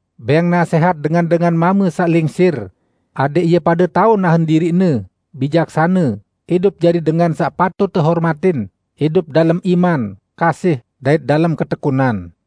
Bẽng nasẽhat dengan-dengan mame saq lingsir, adẽq ie pade tao nahen diriqne, bijaksane, idup jari dengan saq patut tehormatin, idup dalem iman, kasih dait dalem ketekunan.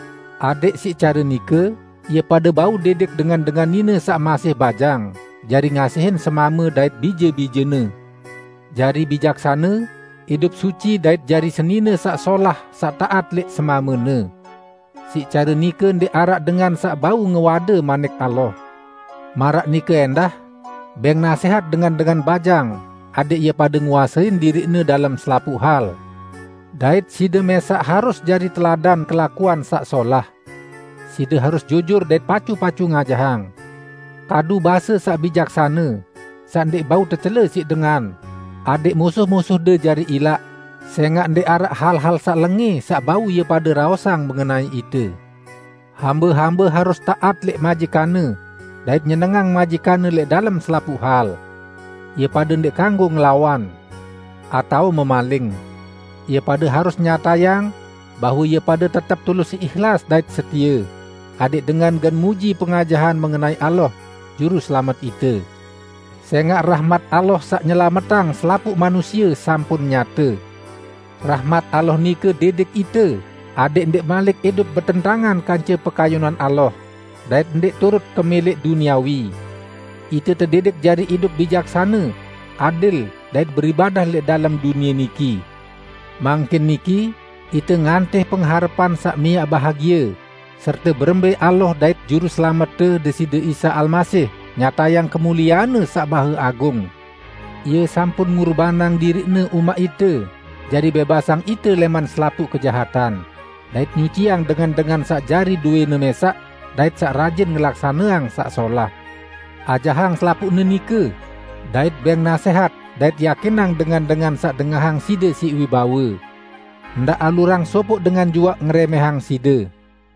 adẽq siq care nike ie pade bau didik dengan-dengan nine saq masih bajang jari ngasihin semame dait bije-bijene, jari bijaksane, idup suci dait jari senine saq solah saq taat lẽq semamene. Siq care nike ndẽq araq dengan saq bau ngewade Manik Allah. Maraq nike ẽndah, bẽng nasẽhat dengan-dengan bajang adẽq ie pade nguasein diriqne dalem selapuq hal, dait side mẽsaq harus jari teladan kelakuan saq solah. Side harus jujur dait pacu-pacu ngajahang. Kadu base saq bijaksane, saq ndẽq bau tecele siq dengan, adẽq musuh-musuhde jari ilaq, sẽngaq ndẽq araq hal-hal saq lengẽ saq bau ie pade raosang mengenai ite. Hambe-hambe harus taat lẽq majikanne, dait nyenengang majikanne lẽq dalem selapuq hal. Ie pade ndẽq kanggo ngelawan, atao memaling. Ie pade harus nyatayang bahwe ie pade tetep tulus ihlas dait setie, adẽq dengan gen muji pengajahan mengenai Allah, Juruselamet ite. Sẽngaq rahmat Allah saq nyelametang selapuq manusie sampun nyate. Rahmat Allah nike didik ite adẽq ndẽq malik idup betentangan kance pekayunan Allah dait ndẽq turut kemẽlẽq duniawi. Ite tedidik jari idup bijaksane, adil dait beribadah lẽq dalem dunie niki. Mangkin niki ite ngantih pengharepan saq miaq bahagie serte berembẽ Allah dait Juruselamette Deside Isa Almasih nyatayang kemuliean-Ne saq Maheagung. Ie sampun ngurbanang diriq-Ne umaq ite jari bẽbasang ite lẽman selapuq kejahatan, dait nyuciang dengan-dengan saq jari dowẽ-Ne mẽsaq, dait saq rajin ngelaksaneang saq solah. Ajahang selapuqne nike, dait bẽng nasẽhat dait yakinang dengan-dengan saq dengahang side siq wibawe. Ndaq alurang sopoq dengan juaq ngerẽmẽhang side.